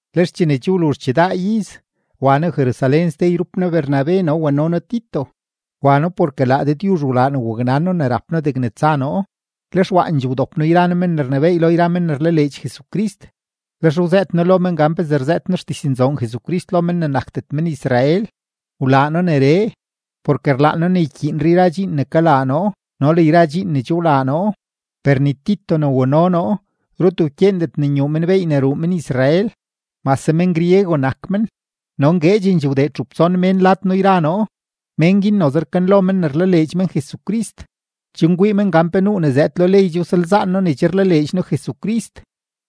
Lex chene che wluzh chidaa iz, wa noo Jerusalén ste yrup noo Bernabe, no wano noo Tito. Wa noo porke laa Dëdyuzh wlaa ne waknan noo ne rap noo degne tsa noo. Lex waandxee wdop noo yra noo men ne rnebééy lo yra men ne rlaleedx Jesucrist, lex wzëët noo lo men gan pezee rzëët noo xdiznzoon Jesucrist lo men ne nakdet men-Israel. Wlaa noo neree, porke rlaan noo ne ykyiinre yra dxiin ne kalaa noo no le yra dxiin ne che wlaa noo. Per ni Tito ne wano noo, rut wkyeendet ne nyuu men beey ne ruu men-Israel, mase men-griego nak men. No ngueedxendxee wdee txup tson mén lad noo yra noo, mén guin noze rkanlo men ne rlaleedx men Jesucrist, chen kwii men gan pe nuu ne zëëd lo ley che wsalzaan noo ne che rlaleedx noo Jesucrist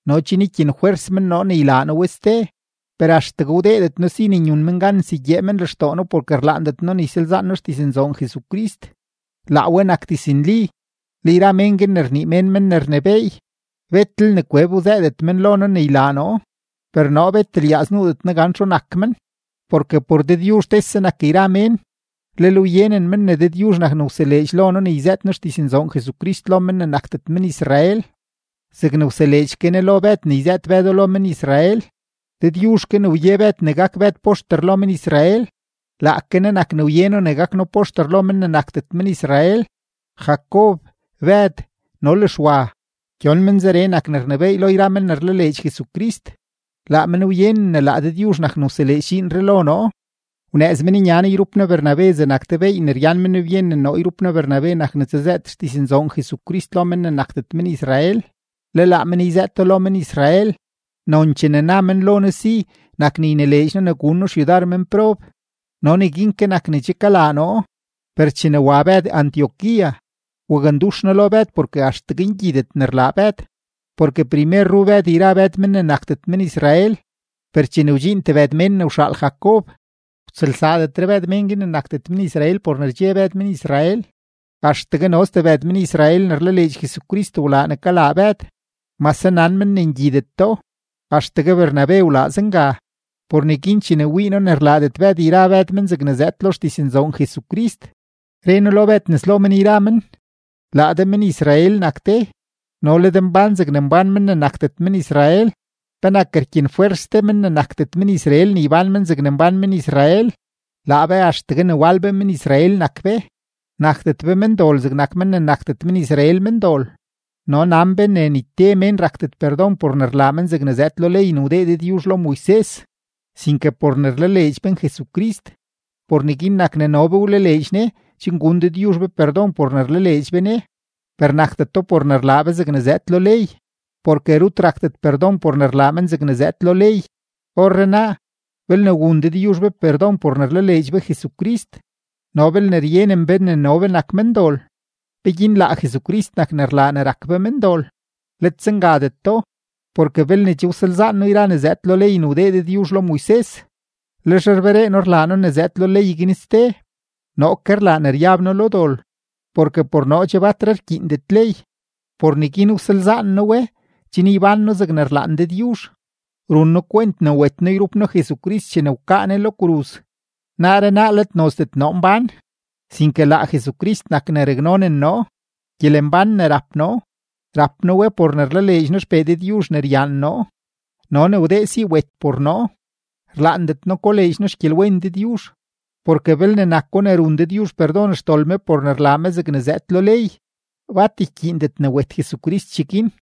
no chen ykyenfwers men noo ne ylaa noo we ste. Per axtegue wdeedet noo si ne nyun men gan nsegyee men lextoo noo porke rlaandet noo ne ysalzaan de xdiznzoon Jesucrist, laa we nak diznli. Le yra men guin ne rnii mén men ne rnebééy, betlel ne kweb wzëëdet men lo noo ne ylaa noo. Per noo bet lyaaz nuudet noo gan txu nak men, porke por Dëdyuzh tese nak yra mén. Lel wyenen men ne Dëdyuzh nak ne wseleedx lo noo ne yzëët noo xdiznzoon Jesucrist lo men ne nakdet men-Israel zegne wseleedx ke Ne lo Bëd ne yzëët Bëdo lo men-Israel. Dëdyuzh ke ne wye Bëd ne gak Bëd poxter lo men-Israel, laake Ne nak ne wye noo ne gak noo poxter lo men ne nakdet men-Israel. Jacob, Bëd, no le Xwa, gyon men zeree nak ne rnebééy lo yra men ne rlaleedx Jesucrist; laa men wyenen ne laa Dëdyuzh nak ne wseleedx dxiinree lo noo. Wnëëz men nya noo yrup noo Bernabe zegnak te beey ne ryan men byen ne noo yrup noo Bernabe nak ne tsazëët xdiznzoon Jesucrist lo men ne nakdet men-Israel, le laa men yzëëto lo men-Israel. Nonchee ne na men lo noo si nak ne ynileedx noo ne gun noo xyudar menprob, no neguin ke nak ne che kalaa noo. Per chene wa Bëd Antioquía, wakndux noo lo Bëd porke axtegue ngyidet ne rlaa Bëd. Porke primer ru Bëd yra Bëd men ne nakdet men-Israel, per chene wdxiin tebëd mén ne wxaal Jacob, wtsëlsaadetre Bëd mén guin ne nakdet men-Israel por ne rdxe Bëd men-Israel; axtegue no stebëd men-Israel ne rlaleedx Jesucrist wlaa ne kalaa Bëd mase nan men ne ngyideto; axtegue Bernabe wlaa zenga. Por neguin chene wii noo ne rlaadet Bëd yra Bëd men zegne zëëd lo xdiznzoon Jesucrist, re noo lo Bëd nes lo men yra men: “Laa de men-Israel nak de, no le de mbán zegne mbán men ne nakdet men-Israel; ¿penak rkyenfwers de men ne nakdet men-Israel ne ybán men zegne mbán men-Israel? “Laa be axtegue ne wal be men-Israel nak be, nakdet be mendol zegnak men ne nakdet men-Israel mendol. No nan be ne ni te mén rakdet perdon por ne rlaa men zegne zëëd lo ley ne wdee Dëdyuzh lo Moises, sinke por ne rlaleedx men Jesucrist. Por neguin nak ne no be wlaleedx Ne chen gun Dëdyuzh be perdon por ne rlaleedx be Ne, per nakdeto por ne rlaa be zegne zëëd lo ley, porke rut rakdet perdon por ne rlaa men zegne zëëd lo ley. “Orrenaa, belne wun Dëdyuzh be perdon por ne rlaleedx be Jesucrist no belne ryenen be ne no be nak mendol, ¿peguin laa Jesucrist nak ne rlaa ne rak be mendol? ¡Let zengadeto! Porke belne che wsalzaan noo yra ne zëëd lo ley ne wdee Dëdyuzh lo Moises, lex rberee noo rlaa noo ne zëëd lo ley guin ste, noo ke rlaa ne ryab noo lo dol. Porke por noo che batre rkyiindet ley, por neguin wsalzaan noo we, chen ybán noo zegne rlaan Dëdyuzh. Run noo kwent ne wet noo yrup noo Jesucrist chene wkaa Ne lo kruz, naaree naa let nozdet noo mbán, sinke laa Jesucrist nak ne raknonen noo; gyelembán ne rap noo, rap noo we por ne rlaleedx noo XPee Dëdyuzh ne ryaan noo no ne wdee si wet por noo. Rlaandet noo koleedx noo xgyelwen Dëdyuzh, porke belne nako ne run Dëdyuzh perdon xdol me por ne rlaa me zegne zëëd lo ley, bat ykyiindet ne wet Jesucrist cheguin.”